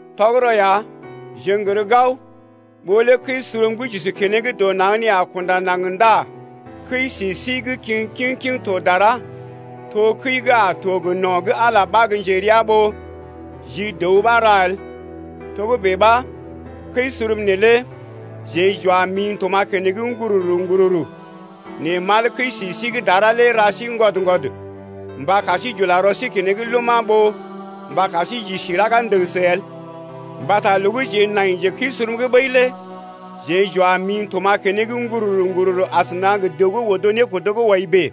Tɔgərɔ ya, jeḛ n’gər gao, ɓó lé kəi-surum gə́ j’isi keneŋ dɔ naŋg nee a kunda naŋg ndá kəi-si sí gə́ kiŋ kiŋ-kiŋ to dara, to kəi gə́ a to gə no̰ gə́ Ala ɓa gə́ njerea, ɓó ji dəw ɓa ra el. Togə́bè ɓa kəi-surum neelé jeḛ j’wa mḭ n’tuma̰ keneŋ ŋgururu-ŋgururu, nɛ mal kəi-si sí gə́ dara lé ra sí ŋgwɔd-ŋgwɔd mba kar sí j’ula rɔ sí keneŋ luma̰ ɓó mba kar sí j’isi raga ndəgəsə el. Mbata loo gə́ jeḛ naije kəi-surum’g ɓəi lé jeḛ j’wa mḭ n’tuma̰ keneŋ ŋgururu-ŋgururu asəna gə dəw gə́ odo nékodo gə́ wɔi bèe,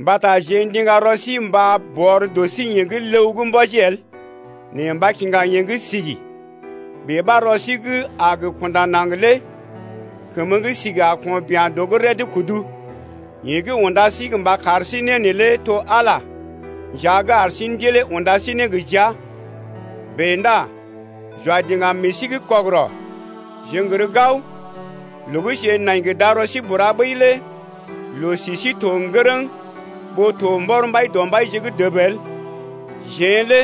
mbata jeḛ ndiŋga rɔ sí mba bɔr dɔ sí yeḛ gə́ ləw’g mbɔji el nɛ mba kiŋga yeḛ gə́ sigi. Bèe ɓa rɔ sí gə́ a gə kunda naŋg lé kəmə gə́ sigi a ko̰ bia̰ dɔ’g réd kudu. Yeḛ gə́ unda sí mba kar sí né neelé to Ala nja gə́ ar sí Ndilee unda sí ne gə jia. Bèe ndá j’wa diŋgam meḛ sí’g kɔgərɔ. Jeḛ n’gər gao, loo gə́ jeḛ nai gə darɔ sí bura ɓəi lé loo-si sí to ŋgərəŋ ɓó to mbɔr Mbaidɔmbaije’g dəb el. Jeḛ lé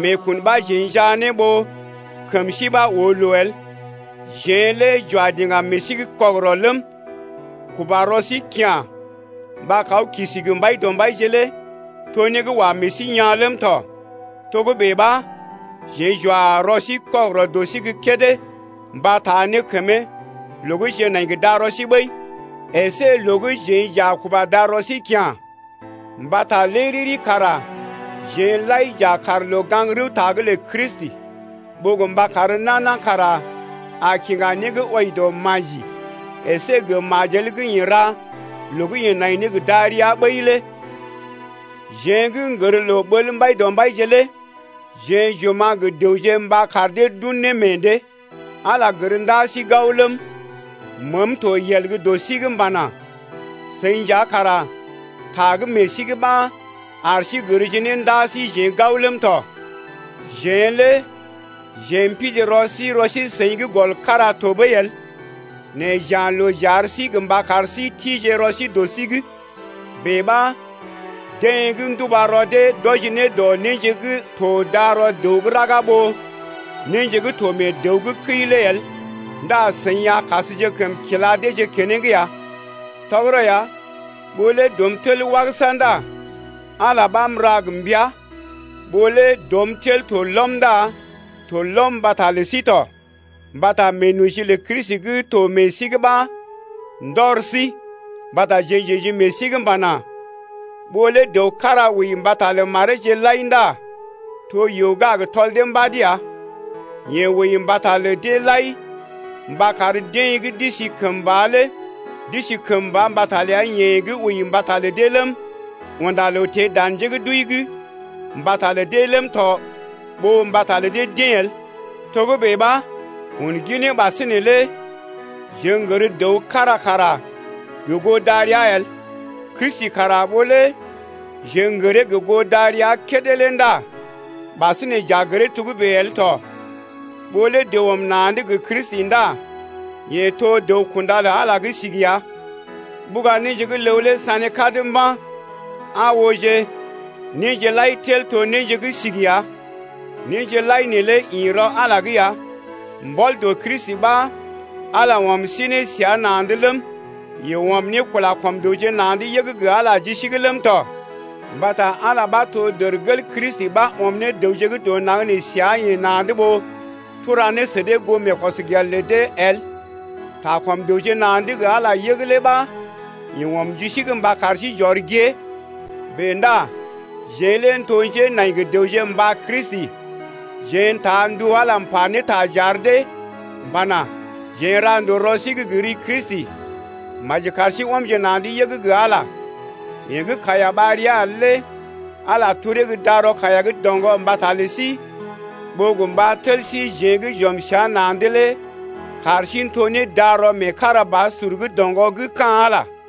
meekun ɓa jeḛ njaa ne ɓó kəm sí ɓa oo loo el. Jeḛ lé j’wa diŋgam meḛ sí’g kɔgərɔ ləm, kuba rɔ sí kya̰ mba kaw kisi gə Mbaidɔmbaije lé to né gə́ wa meḛ sí yaa̰ ləm tɔ. Togə́bè ɓa jeḛ j’wa rɔ sí kɔgərɔ dɔ sí gə́ kédé mbata taa ne kəmee loo gə́ jeḛ nai gə darɔ sí ɓəi əsé loo gə́ jeḛ j’a kuba darɔ sí kya̰. Mbata lé riri kara jeḛ lai j’a kaarje loo gaŋg-rəwta’g lə Kristi, ɓó gə mba kar nana kara a kiŋga né gə́ wɔji dɔ maji əsé gə majel gə́ yeḛ ra loo gə́ yeḛ nai ne gə darəa ɓəi lé. Jeḛ gə́ n’gər loo ɓəl Mbaidɔmbaije lé jeḛ j’oma̰ gə dəwje mba kar dee d’un ne meḛ dee. Ala gər ndaa sí gao ləm, məəm to yel gə́ dɔ sí’g m’pana: Seḭ nja kara ta gə́ meḛ sí’g ɓa ar sí gərje ne ndaa síjeḛ gao ləm tɔ. Jeḛ lé jeḛ m’pidi rɔ sí rɔ sí-seḭ’g gɔl kára tɔɓəi el nɛ j’ya̰ loo j’ar sí gə mba kar sí tije rɔ sí dɔ sí’g. Bèe ɓa deḛ gə́ nduba rɔ dee d’wɔji ne dɔ néje gə́ to darɔ dəw gə́ raga ɓó néje gə́ to mee dəw gə́ kəi’g lé el ndá seḭ a kasjekəm kila deeje keneŋ ya. Tɔgərɔ ya, ɓó lé dɔm tel wagəsa ndá Ala ɓa m’ra gə mbəa. Ɓó lé dɔm tel to lɔm ndá to lɔm mbata lə sí tɔ. Mbata meenoji lə Kristi gə́ to meḛ sí’g ɓa ndɔr sí mbata jeḛ j’ə̰ji meḛ sí’g m’pana: Ɓó lé dəw kára wəi mbata mareeje lai ndá to yoo gə́ a gə tɔl dee mbad ya. Yeḛ wəi mbata lə deḛ lai mba kar deḛ gə́ d’isi kəmba lé d’isi kəmba mbata ləa-yeḛ gə́ wəi mbata lə dee ləm, unda loo teḛ dan njé gə́ d’wəi’g mbata lə dee ləm tɔ ɓó mbata lə dee-deḛ el. Togə́bè ɓa un ginee ɓasinè lé jeḛ n’gər dəw kára kara gə goo darəa el. Kristi kara ɓó lé jeḛ n’gəree gə goo darəa kédé lé ndá ɓasinè j’a gəree togə́bè el tɔ. Ɓó lé dəw ɔm na̰’d gə Kristi ndá yeḛ to dəw-kunda lə Ala gə́ sigi ya. Ɓuga néje gə́ ləw lé sané kad mba̰, aa ooje, néje lai tel to néje gə́ sigi ya. Néje lai neelé ḭ rɔ Ala’g ya. Mbɔl dɔ Kristi ɓa Ala lé ɔm sí ne səa na̰’d ləm, yeḛ ɔm ne kula kɔm dəwje na̰’d yəg gə Ala ji sí’g ləm tɔ. Mbata Ala ɓa to dərgel Kristi ɓa ɔm ne dəwje gə́ dɔ naŋg nee səa-yeḛ na̰’d ɓó tura ne sə dee goo meekɔsgel lə dee el. Ta kɔm dəwje na̰’d gə Ala yəg lé ɓa yeḛ ɔm ji sí’g mba kar sí j’ɔr gée. Bèe ndá jeḛ lé n’to njenai gə dəwje mba Kristi, jeḛ n’taa ndu Ala m’pa ne ta j’ar dee pana: Jeḛ n’ra ndòo rɔ sí’g gə ri Kristi, maji kar sí ɔmje na̰’d yəg gə Ala ya. Yeḛ gə́ kaiya ɓar ria el lé Ala telee gə́ darɔ kaiya gə́ doŋgɔ mbata lə sí ɓó gə mba tel síjeḛ gə́ j’ɔm səa na̰’d lé kar sí n’to ne darɔ meekarabasur gə́ doŋgɔ gə́ ka̰ Ala lé.